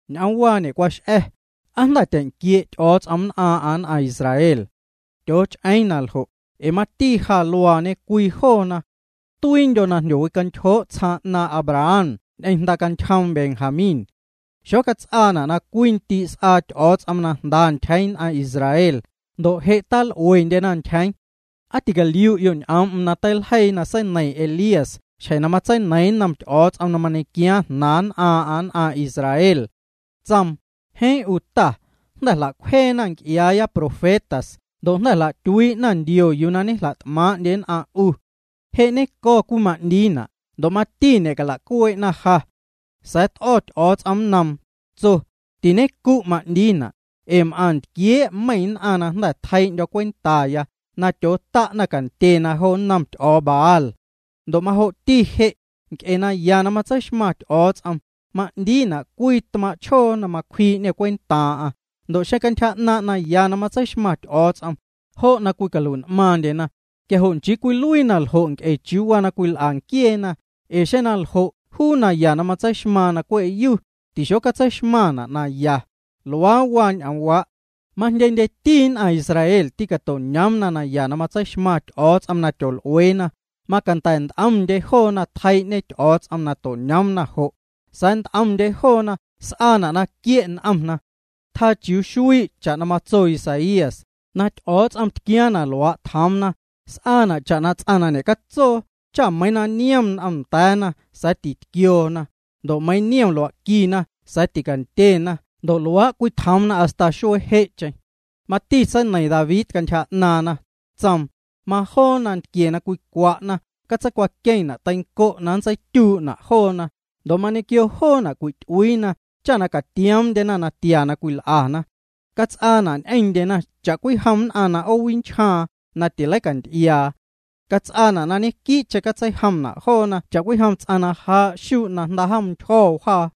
Ñ'oomwaa ñe'cwax'a̱, ¿aa jnda̱ tyeⁿnquie' Ty'o̱o̱ts'om nn'aaⁿ'aⁿ nn'aⁿ Israel? Tyooch'eeⁿ na ljo', ee mati ja luaañe cwii joona. Tuiindyo̱ na jndyowicantyjoo' tsjaaⁿ 'naaⁿ' Abraham ñ'eⁿ jndacantyjoom Benjamín. Xocats'aana' na cwii ndii' s'aa Ty'o̱o̱ts'om na jnda ntyjeeⁿ nn'aⁿ Israel ndo' je' tal'uendyena ntyjeeⁿ. ¿Aa ticaliu'yo' ñ'oom'm na teiljeii na seineiⁿ Elías xjeⁿ na matseineiiⁿ nnom Ty'o̱o̱ts'om na mañequiaaⁿ jnaaⁿ nc'iaaⁿ'aⁿ nn'aⁿ Israel? Tsoom: “Jeeⁿ 'u Ta, jnda̱ jla'cwjeena nc'iaaya profetas ndo' jnda̱ jla'tyuii'na ndio yuu na ñejla't'maaⁿ'ndye nn'aⁿ 'u. Je' ñenco̱ cwima'ndiina', ndo' mati ñe'cala'cuee'na ja.” Sa̱a̱ t'o̱ Ty'o̱o̱ts'om nnoom, tso: “Tiñencu' cwima'ndiina', ee m'aⁿ ntquiee' meiⁿ nn'aⁿ na jnda̱ tjeii'ndyo̱ cwentaya na tyoota' cantye jo nnom ty'o̱o̱ Baal.” Ndo' majo'ti je', nc'e naya na matseixmaⁿ Ty'o̱o̱ts'om, ma'ndiina' cwii tmaaⁿ' chjoo na macwjii'ñê cwentaaⁿ'aⁿ. Ndo' xeⁿ cantyja 'naaⁿ' naya na matseixmaⁿ Ty'o̱o̱ts'om, jo' na cwicalui'n'maaⁿndyena, quia jo' nchii cwiluii na ljo' nc'e chiuu na cwil'a nquieena. Ee xeⁿ naljo', juu naya na matseixmaaⁿ na cwe' yu, tixocatseixmaⁿna' naya. Luaa waa ñ'oomwaa'. Majndyendyeti nn'aⁿ Israel tîcato'ñoomna naya na matseixmaⁿ Ty'o̱o̱ts'om na tyol'ueena, macanda̱ nt'omndye joona na tjeii'ñe Ty'o̱o̱ts'om to'ñoomna jo'. Sa̱a̱ nt'omndye joona s'aana' na quie' n'omna. Tjaa chiuu xuii' cha'na matso Isaías: “Na Ty'o̱o̱ts'om tquiaaⁿ na tjoomna, s'aana' cha'na ts'aⁿ na ñe'catsoo cha meiiⁿ na niom n'om nda̱a̱na sa̱a̱ titquioona, ndo' meiiⁿ na niom lua'quina sa̱a̱ ticandyena ndo' luaa' cwitjoomna hasta xjeⁿ je'cheⁿ.” Mati seineiⁿ David cantyja 'naaⁿna, tsoom: Majoo nantquie na cwicwa'na catseicwaqueⁿna' teiⁿnco' na nntseityuu'na' joona, ndo' mañequio joona' cwi'ty'uiina cha na catioomndyena natia na cwil'ana. Cats'aana' ñ'eⁿndyena cha'cwijom nn'aⁿ na 'oowinchjaaⁿ na tileicanty'iaa. Cats'aana' na ñequii'cheⁿ catseijomna' joona cha'cwijom ts'aⁿ na jaa' xuu' na jnda'jom ntyjo̱ wjaa.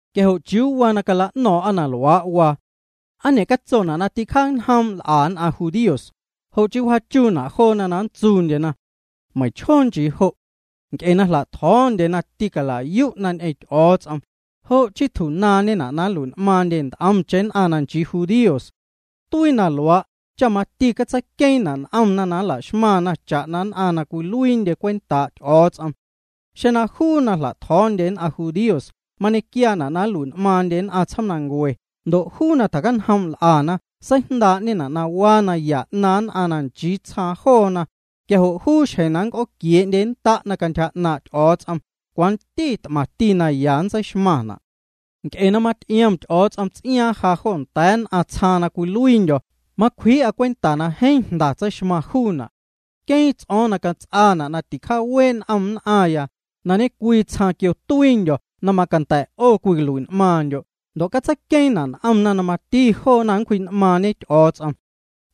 Quia jo' ¿chiuu waa na cala'no̱o̱ⁿ'a na luaa' waa? ¿Aa ñe'catsona' na ticjaañjoom' l'a nn'aⁿ judíos, jo' cha wjaachuuna' joona na nntsuundyena? Jeeⁿ nchii jo'. Nc'e na jla'tjo̱o̱ndyena na tîcala'yu'na ñ'eⁿ Ty'o̱o̱ts'om, jo' chii tju'naaⁿñeyuuna' na nlui'n'maaⁿndye nt'omcheⁿ nn'aⁿ na tachii judíos. Tuii na luaa' cha mati catseiqueeⁿna' n'omna na nla'xmaⁿna cha'na nn'aⁿ na cwiluiindye cwentaa' Ty'o̱o̱ts'om. Xeⁿ juu na jla'tjo̱o̱ndye nn'aⁿ judíos mañequiaana' na nlui'n'maaⁿndye nn'aⁿ tsjoomnancue ndo' juu na ticjaacañjoom' na l'ana seijndaa'ñena' na waa naya 'naaⁿ nn'aⁿ na nchii tsjaaⁿ joona, quia jo' juu xjeⁿ na nnc'ooquie'nnda'na cantyja 'naaⁿ' Ty'o̱o̱ts'om, cwanti t'maⁿti naya nntseixmaⁿna'. Nc'e na maty'iom Ty'o̱o̱ts'om ts'iaaⁿ ja jo nda̱a̱ nn'aⁿ tsjaaⁿ na cwiluiindyo', macwjii'a cwenta na jeeⁿ jnda tseixmaⁿ juuna'. Queeⁿ ts'o̱o̱ⁿya na cats'aana' na ticjaawee' n'om nn'aⁿya na ñe'cwii tsjaaⁿ quio tuiindyo̱ na macanda̱ 'o cwicalui'n'maaⁿndyo' ndo' catseiqueeⁿna' n'omna na mati joona cwji'n'maaⁿñe Ty'o̱o̱ts'om.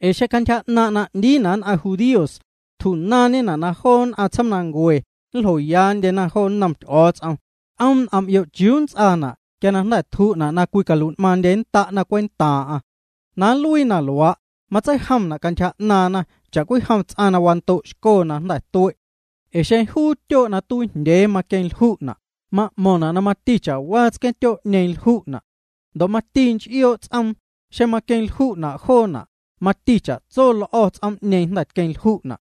Ee xeⁿ cantyja 'naaⁿ' na 'ndiina' nn'aⁿ judíos, tju'naaⁿñena' na joo nn'aⁿ tsjoomnancue nljoyaandyena jo nnom Ty'o̱o̱ts'om, c'oom' n'om'yo' chiuu nnts'aana' quia na jnda̱ tju'na' na cwiluiindyennda'na cwentaaⁿ'aⁿ. Na nluii na luaa', nntseijomna' cantyja 'naaⁿna cha'cwijom ts'aⁿ na wando'xco na jnda̱ tue'. Ee xeⁿ juu tsqueeⁿtyoo' na cwineiiⁿjndyee cwiluiiñena' na lju'na', ma'mo̱ⁿna' na mati cha'waa tsquee'ñeeⁿ lju'na'. Ndo' mati nch'ioo' ts'oom, xeⁿ maqueⁿ lju'na' joona', mati chatso l'o̱ ts'oom jnda̱ tqueⁿlju'na'.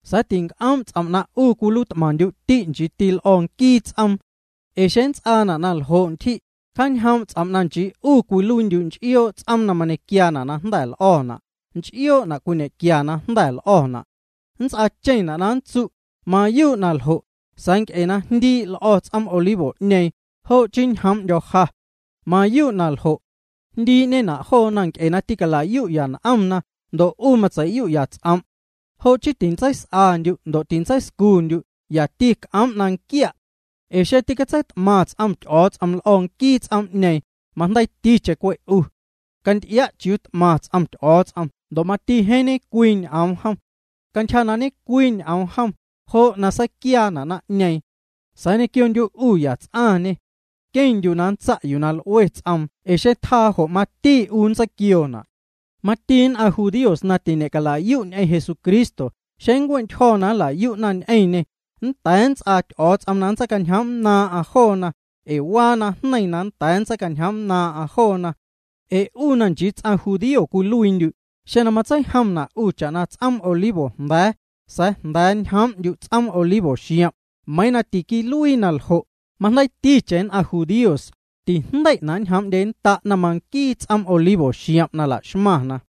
Sa̱a̱ tinc'oom' ts'om' na 'u cwiluiit'maⁿndyu'ti' nchiiti l'o̱ nquii ts'oom. Ee xeⁿ na nnts'aana' na ljo' ntyji', cjaañjoom' ts'om' na nchii 'u cwiluiindyu' nch'ioo' ts'oom na mañequiaa' na jnda̱ l'o̱na', nch'ioo'na' cwiñequia na jnda̱ l'o̱na'. Nnts'aacheⁿna' na nntsu': “Mayuu' na ljo', sa̱a̱ nc'e na jndii' l'o̱ ts'oom olivo'ñeeⁿ, jo' chii ñjoom'ndyo̱ ja.” Mayuu' na ljo'. Jndii'ñena' joona nc'e na ticala'yu'ya n'omna, ndo' 'u tyeⁿ meiⁿntyje' na matseiyu'ya ts'om'. Jo' chii tintseis'andyu' ndo' tintseiscundyu', yati c'oom' na nquia'. Ee xeⁿ tîcatseit'maⁿ ts'om Ty'o̱o̱ts'om l'o̱ nquii ts'oom'ñeeⁿ, majndeiiticheⁿ cwe' 'u. Canty'ia' chiuu t'maⁿ ts'om Ty'o̱o̱ts'om ndo' mati jeeⁿ ñecwii ñ'oom jom. Cantyja na ñecwii ñ'oom jom, jo' na seiquiaana' naⁿ'ñeeⁿ. Sa̱a̱ ñequiondyu' 'u yats'aⁿñê. Queⁿndyu' na nntsa' yuu na l'ue ts'oom ee xeⁿ tjaa jo' mati 'u nntseiquioona'. Mati nn'aⁿ judíos na tiñe'cala'yu' ñ'eⁿ Jesucristo, xeⁿ nncue'ntyjo̱ na nla'yu'na ñ'eⁿñê, nnda̱a̱ nnts'aa Ty'o̱o̱ts'om na nntseicañjoom'nnaaⁿ'aⁿ joona, ee waa na jneiⁿ na nnda̱a̱ nntseicañjoom'nnaaⁿ'aⁿ joona. Ee 'u na nchii ts'aⁿ judío cwiluiindyu', xeⁿ na matseijomna' 'u cha'na ts'oom olivo jnda̱a̱, sa̱a̱ jnda̱ ñjoom'ndyu' ts'oom olivo xiom', meiiⁿ na tiquiluii na ljo', majndeiiticheⁿ cantyja 'naaⁿ nn'aⁿ judíos, tijndei'na' na nñjoom'ndyennda'na manquiiti ts'oom olivo xiom' na la'xmaⁿna.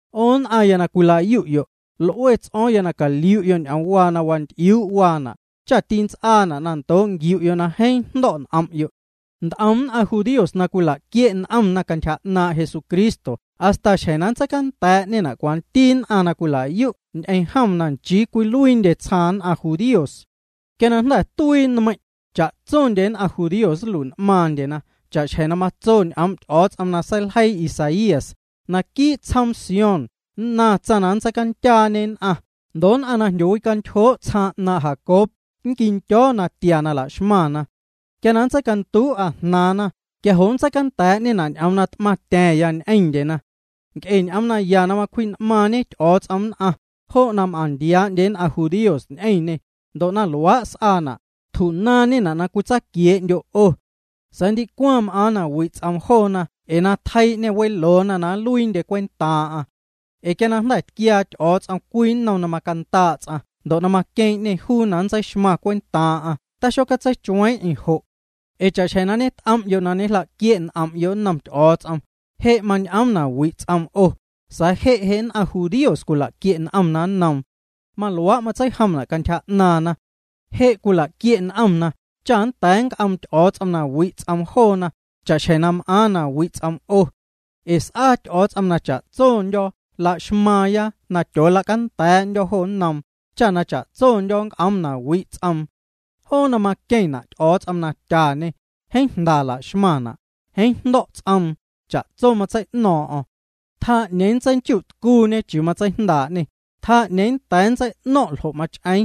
'O nn'aⁿya na cwila'yu'yo', l'ue ts'o̱o̱ⁿya na caliu'yo' ñ'oomwaa na wanty'iuu' waana', cha tints'aana' ndoo' nquiu'yo' na jeeⁿ jndo̱' n'om'yo'. Nt'om nn'aⁿ judíos cwila'quie' n'omna cantyja 'naaⁿ' Jesucristo hasta xjeⁿ na nntseicanda̱a̱'ñena' lojoo nn'aⁿ na cwila'yu' ñ'eⁿ jom na nchii cwiluiindyena tsjaaⁿ nn'aⁿ judíos. Quia na jnda̱ tuii nmeiⁿ', cha'tsondye nn'aⁿ judíos nlui'n'maaⁿndyena cha'xjeⁿ na matso ñ'oom' Ty'o̱o̱ts'om na seiljeii Isaías: Naquii' tsjoom Sión nnaⁿ tsaⁿ na nntseicandyaañe nn'aⁿ ndo' nn'aⁿ na jndyowicantyjoo' tsjaaⁿ 'naaⁿ' Jacob nnquindyo̱ natia na la'xmaⁿna. Quia na nntseicanduu'a jnaaⁿna quia jo' nntseicanda̱a̱'ñena' ñ'oom na t'maⁿtya̱a̱ⁿya ñ'eⁿndyena. Nc'e ñ'oom naya na macwji'n'maaⁿñe Ty'o̱o̱ts'om nn'aⁿ, jo' na m'aⁿntiaa'ndye nn'aⁿ judíos ñ'eⁿñê, ndo' na luaa' s'aana', tju'naaⁿñena' na cwitsaaquiee'ndyo' 'o. Sa̱a̱ ndicwaⁿ m'aaⁿ na wi' ts'oom joona na tjeii'ñê weloona na nluiindye cwentaaⁿ'aⁿ. Ee quia na jnda̱ tquiaa Ty'o̱o̱ts'om cwii nnom na macandaa' ts'aⁿ ndo' na maqueeⁿ'ñê juu na nntseixmaⁿ cwentaaⁿ'aⁿ taxocatseichueeⁿ'eⁿ jo'. Ee cha'xjeⁿ na ñet'om'yo' na ñejla'quie' n'om'yo' nnom Ty'o̱o̱ts'om, je' mañ'oom na wi' ts'oom 'o, sa̱a̱ je' je' nn'aⁿ judíos cwila'quie' n'omna nnoom. Maluaa' matseijomna' cantyja 'naaⁿna. Je' cwila'quie' n'omna cha nda̱nquia nnc'oom Ty'o̱o̱ts'om na wi' ts'oom joona, cha'xjeⁿ je' m'aaⁿ na wi' ts'oom 'o. Ee s'aa Ty'o̱o̱ts'om na cha'tsondyo̱ la'xmaaⁿya na tyoola'canda̱a̱'ndyo̱ jo nnoom, cha na cha'tsondyo̱ nnc'oom na wi' ts'oom. Joo na maqueⁿna' Ty'o̱o̱ts'om na tyañe, jeeⁿ jnda laxmaⁿna', jeeⁿ jndo̱' ts'oom, cha'tso matsei'no̱o̱ⁿ'o̱ⁿ. Tjaa 'ñeeⁿ nntseinchu'tcuuñe chiuu matseijndaa'ñê, tjaa 'ñeeⁿ nnda̱a̱ nntsei'no̱ⁿ' ljo' na mach'eeⁿ.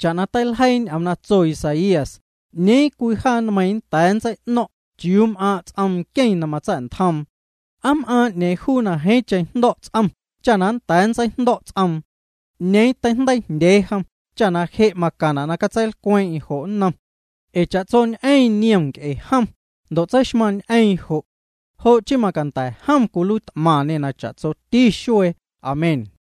Cha'na teiljeii ñ'oom na tso Isaías: “¿'Ñeeⁿ cwii jaa nmeiiⁿñe nnda̱a̱ nntseino̱ⁿ' chiuu m'aaⁿ' ts'om nqueⁿ na matsa̱'ntjoom? ¿Aa m'aaⁿ 'ñeeⁿ juu na jeeⁿcheⁿ jndo̱' ts'om cha na nnda̱a̱ nntseijndo̱' ts'oom? ¿'Ñeeⁿ teijndeiijndyee jom cha je' macaⁿna' na catseilcweeⁿ'eⁿ jo' nnom juu?” Ee cha'tsoñ'eⁿ niom nc'e jom, ndo' tseixmaⁿñ'eeⁿ jo'. Jo' chii macanda̱ jom caluiit'maⁿñê cha'waati xuee. Amén.